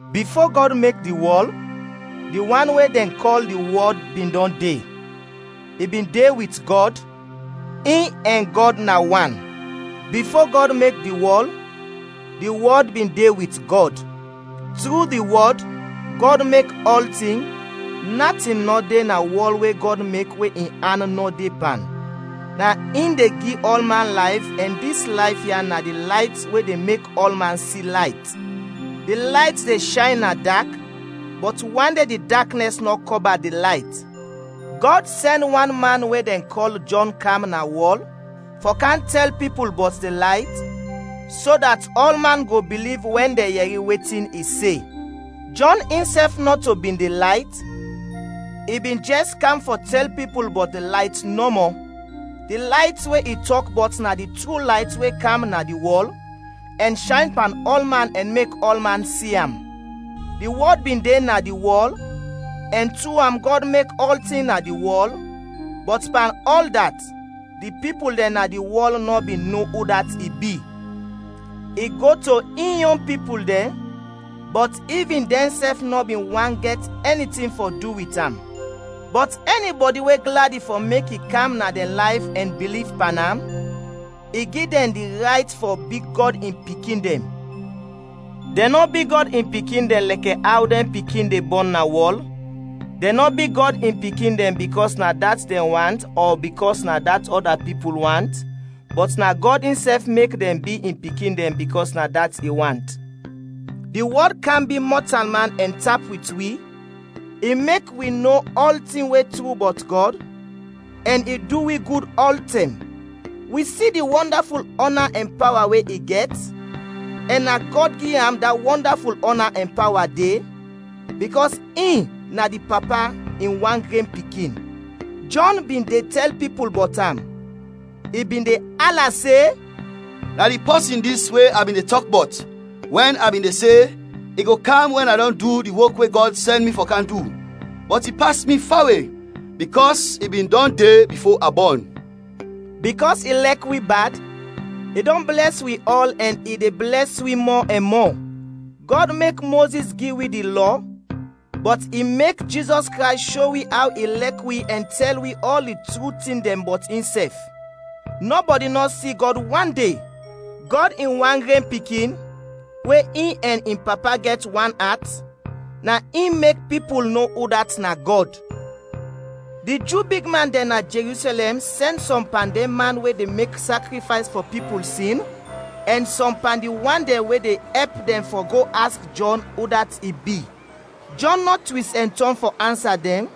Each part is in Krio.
Bifo Gɔd mek di wɔl, di wan we dɛn kɔl di Wɔd bin dɔn de, i bin de wit Gɔd, in ɛn Gɔd na wan. Bifo Gɔd mek di wɔl, di Wɔd bin de wit Gɔd. Tru di Wɔd, Gɔd mek ɔltin; natin nɔ de na wɔl we Gɔd mek we in an nɔ de pan. Na in de gi ɔlman layf ɛn dis layf ya na di layt we de mek ɔlman si layt. Di layt de shayn na dak, bɔt wande di daknɛs nɔ kɔba di layt. Gɔd sɛn wan man we dɛn kɔl Jɔn kam na wɔl fɔ kam tɛl pipul bɔt di layt, so dat ɔlman go biliv wɛn dɛn yɛri wetin i se. Jɔn insɛf nɔto bin di layt, i bin jɛs kam fɔ tɛl pipul bɔt di layt nɔmɔ. Di layt we i tɔk bɔt na di tru layt we kam na di wɔl, ɛn shayn pan ɔlman ɛn mek ɔlman si am. Di Wɔd bin de na di wɔl, ɛn tru am Gɔd mek ɔltin na di wɔl, bɔt pan ɔl dat, di pipul dɛn na di wɔl nɔ bin no udat i bi. I go to in yon pipul dɛn, bɔt ivin dɛnsɛf nɔ bin want gɛt ɛni tin fɔ du wit am. Bɔt ɛnibɔdi we gladi fɔ mek i kam na dɛn layf ɛn biliv pan am, i gi dɛn di rayt fɔ bi Gɔd in pikin dɛn. Dɛn nɔ bi Gɔd in pikin dɛn lɛkɛ aw dɛn pikin de bɔn na wɔl, dɛn nɔ bi Gɔd in pikin dɛn bikɔs na dat dɛn want ɔ bikɔs na dat ɔda pipul want, bɔt na Gɔd insɛf mek dɛn bi in pikin dɛn bikɔs na dat i want. Di Wɔd kam bi mɔtalman ɛn tap wit wi, i mek wi no ɔltin we tru bɔt Gɔd, ɛn i du wi gud ɔltɛm. Wi si di wɔndaful ɔna ɛn pawa we i gɛt, ɛn na Gɔd gi am da wɔndaful ɔna ɛn pawa de, bikɔs in na di Papa in wan gren Pikin. Jɔn bin de tɛl pipul bɔt am. I bin de ala se, “Na di pɔsin dis we a bin de tɔk bɔt, wɛn a bin de se, ‘I go kam wɛn a dɔn du di wok we Gɔd sɛn mi fɔ kam du, bɔt i pas mi fawe, bikɔs i bin dɔn de bifo a bɔn.’” Bikɔs i lɛk wi bad, i dɔn blɛs wi ɔl ɛn i de blɛs wi mɔ ɛn mɔ Gɔd mek Mozis gi wi di Lɔ, bɔt i mek Jizɔs Krays sho wi aw i lɛk wi ɛn tɛl wi ɔl di tru tin dɛn bɔt insɛf. Nɔbɔdi nɔ si Gɔd wande. Gɔd in wan gren Pikin, we in ɛn in Papa gɛt wan at, na in mek pipul no udat na Gɔd. Di Ju bigman dɛn na Jerusɛlɛm sɛn sɔm pan dɛn man we de mek sakrifays fɔ pipul sin ɛn sɔm pan di wan dɛn we de ɛp dɛn fɔ go aks Jɔn udat i bi. Jɔn nɔ twis ɛn tɔn fɔ ansa dɛn,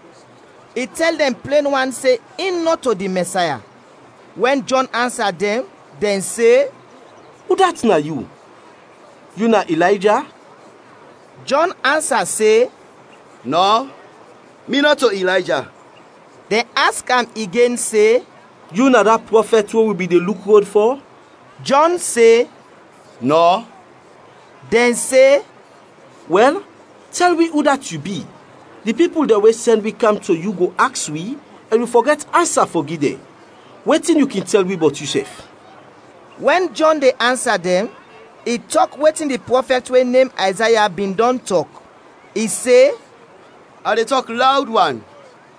i tɛl dɛn plen wan se in nɔto di Mɛsaya. Wɛn Jɔn ansa dɛn, dɛn se, “Udat na yu? Yu na Ilayja?” Jɔn ansa se, “Nɔ, mi nɔto Ilayja.” Dɛn aks am igen se, “Yu na da prɔfɛt we wi bin de luk rod fɔ?” Jɔn se, “Nɔ.” Dɛn se, “Wɛl, tɛl wi udat yu bi? Di pipul dɛn we sɛn wi kam to yu go aks wi ɛn wi fɔ gɛt ansa fɔ gi dɛn. Wetin yu kin tɛl wi bɔt yusɛf?” Wɛn Jɔn de ansa dɛn, i tɔk wetin di prɔfɛt we nem Ayzaya bin dɔn tɔk. I se: “ ‘A de tɔk lawd wan,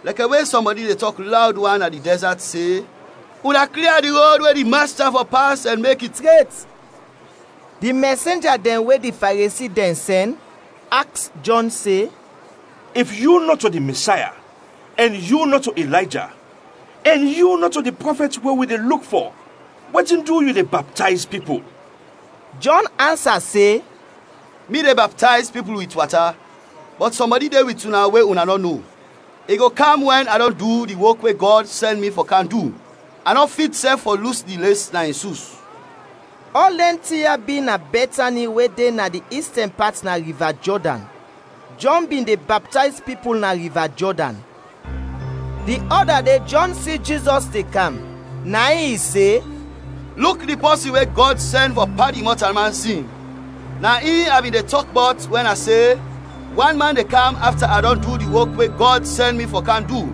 lɛkɛ we sɔmbɔdi de tɔk lawd wan na di dɛzat se: Una klia di rod we di Masta fɔ pas ɛn mek i tret!’” Di mɛsenja dɛn we di Faresi dɛn sɛn, aks Jɔn se, “If yu nɔto di Mɛsaya, ɛn yu nɔto Ilayja, ɛn yu nɔto di prɔfɛt we wi de luk fɔ, wetin du yu de baptayz pipul?” Jɔn ansa se, “Mi de baptayz pipul wit wata, bɔt sɔmbɔdi de wit una, we una nɔ no. I go kam wɛn a dɔn du di wok we Gɔd sɛn mi fɔ kam du, a nɔ fit sɛf fɔ lus di les na in sus.” Ɔl dɛn tin ya bi na Bɛtani we de na di istɛn pat na Riva Jɔdan. Jɔn bin de baptayz pipul na Riva Jɔdan. Di ɔda de Jɔn si Jizɔs de kam, na in i se, “Luk di Pɔsin we Gɔd sɛn fɔ padin mɔtalman sin! Na in a bin de tɔk bɔt wɛn a se, ‘Wan man de kam afta a dɔn du di wok we Gɔd sɛn mi fɔ kam du,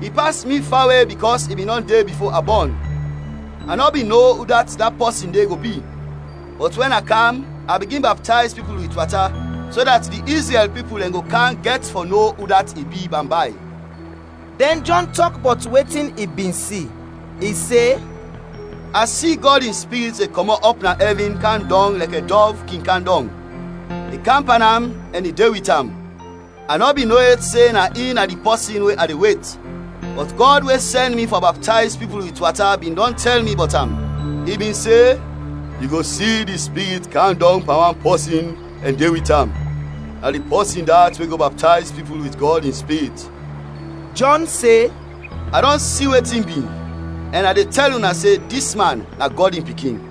i pas mi fawe bikɔs i bin dɔn de bifo a bɔn.’ A nɔ bin no udat da pɔsin de go bi, bɔt wɛn a kam a bigin baptayz pipul wit wata, so dat di Izrɛl pipul dɛn go kam gɛt fɔ no udat i bi bambay.” Dɛn Jɔn tɔk bɔt wetin i bin si, i se: “A si Gɔd in Spirit de kɔmɔt ɔp na ɛvin kam dɔng lɛkɛ dɔv kin kam dɔng. I kam pan am ɛn de wit am. A nɔ bin no yet se na in na di Pɔsin we a de wet, bɔt Gɔd we sɛn mi fɔ baptayz pipul wit wata bin dɔn tɛl mi bɔt am. I bin se, ‘Yu go si di Spirit kam dɔng pan wan pɔsin ɛn de wit am; na di pɔsin dat we go baptayz pipul wit Gɔd in Spirit.’” Jɔn se, “A dɔn si wetin bi, ɛn a de tɛl una se dis man na Gɔd in Pikin.”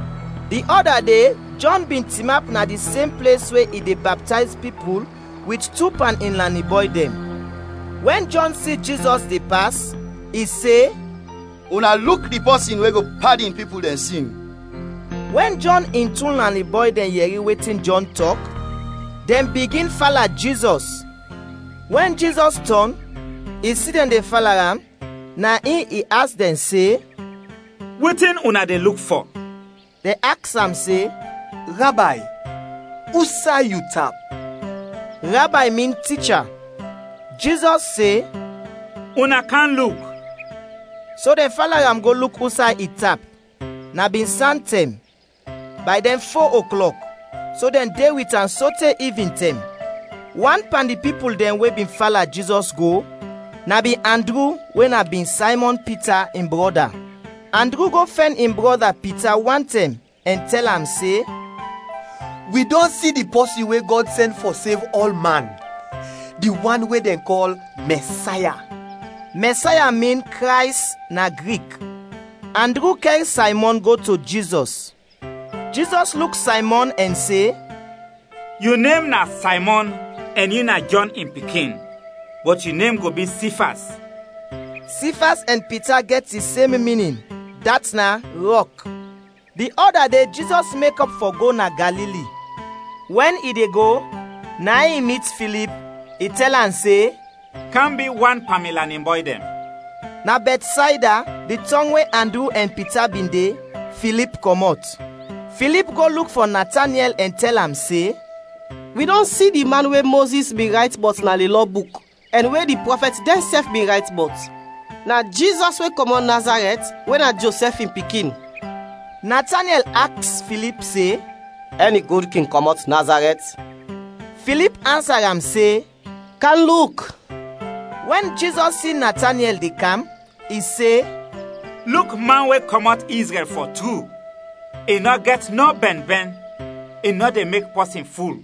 Di ɔda de Jɔn bin tinap na di sem ples we i de baptayz pipul wit tu pan in lanin bɔy dɛn. Wɛn Jɔn si Jizɔs de pas, i se, “Una luk di pɔsin we go padin pipul dɛn sin!” Wɛn Jɔn in tu lanin bɔy dɛn yɛri wetin Jɔn tɔk, dɛn bigin fala Jizɔs. Wɛn Jizɔs tɔn, i si dɛn de fala am, na in i aks dɛn se, “Wetin una de luk fɔ?” Dɛn aks am se, “Rabay, usay yu tap?” (Rabay min Ticha.) Jizɔs se, “Una kam luk!” So dɛn fala am go luk usay i tap; na bin santɛm, bay dɛn fo oklɔk, so dɛn de wit am sote ivintɛm. Wan pan di pipul dɛn we bin fala Jizɔs go na bin Andru we na bin Saymɔn Pita in brɔda. Andru go fɛn in brɔda Pita wantɛm ɛn tɛl am se, “Wi dɔn si di pɔsin we Gɔd sɛn fɔ sev ɔlman, di wan we dɛn kɔl Mɛsaya.” (Mɛsaya min “Krays” na Grik.) Andru kɛr Saymɔn go to Jizɔs. Jizɔs luk Saymɔn ɛn se, “Yu nem na Saymɔn ɛn yu na Jɔn in pikin, bɔt yu nem go bi Sifas.” (Sifas ɛn Pita gɛt di sem minin, dat na “Rɔk”.) Di ɔda de Jizɔs mekɔp fɔ go na Galili. Wɛn i de go, na in i mit Filip, i tɛl am se, “Kam bi wan pan mi lanin bɔy dɛn!” Na Bɛtsayda, di tɔng we Andru ɛn Pita bin de, Filip kɔmɔt. Filip go luk fɔ Natanyɛl ɛn tɛl am se, “Wi dɔn si di man we Mozis bin rayt bɔt na di Lɔ buk, ɛn we di prɔfɛt dɛnsɛf bin rayt bɔt. Na Jizɔs we kɔmɔt Nazarɛt we na Josɛf in pikin.” Natanyɛl aks Filip se, “Ɛni tin gud kin kɔmɔt Nazarɛt?” Filip ansa am se, “Kam luk!” Wɛn Jizɔs si Natanyɛl de kam, i se, “Luk man we kɔmɔt Izrɛl fɔ tru, i nɔ gɛt nɔ bɛnbɛn, i nɔ de mek pɔsin ful.”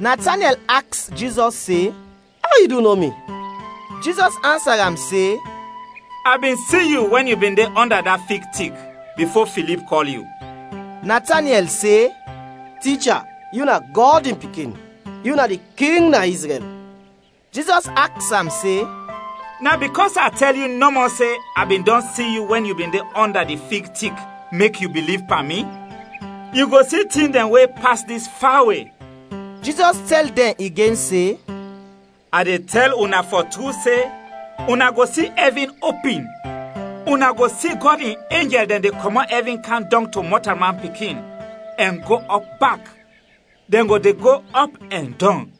Natanyɛl aks Jizɔs se, “Aw yu du no mi?” Jizɔs ansa am se, “A bin si yu wɛn yu bin de ɔnda da fig tik bifo Filip kɔl yu.” Natanyɛl se, “Ticha, yu na Gɔd in Pikin! Yu na di King na Izrɛl!” Jizɔs aks am se, “Na bikɔs a tɛl yu nɔmɔ se a bin dɔn si yu wɛn yu bin de ɔnda di fig tik, mek yu biliv pan mi? Yu go si tin dɛn we pas dis fawe.” Jizɔs tɛl dɛn igen se, “A de tɛl una fɔ tru se: una go si ɛvin opin, una go si Gɔd in enjɛl dɛn de kɔmɔt ɛvin kam dɔng to Mɔtalman Pikin ɛn go ɔp bak, dɛn go de go ɔp ɛn dɔng.”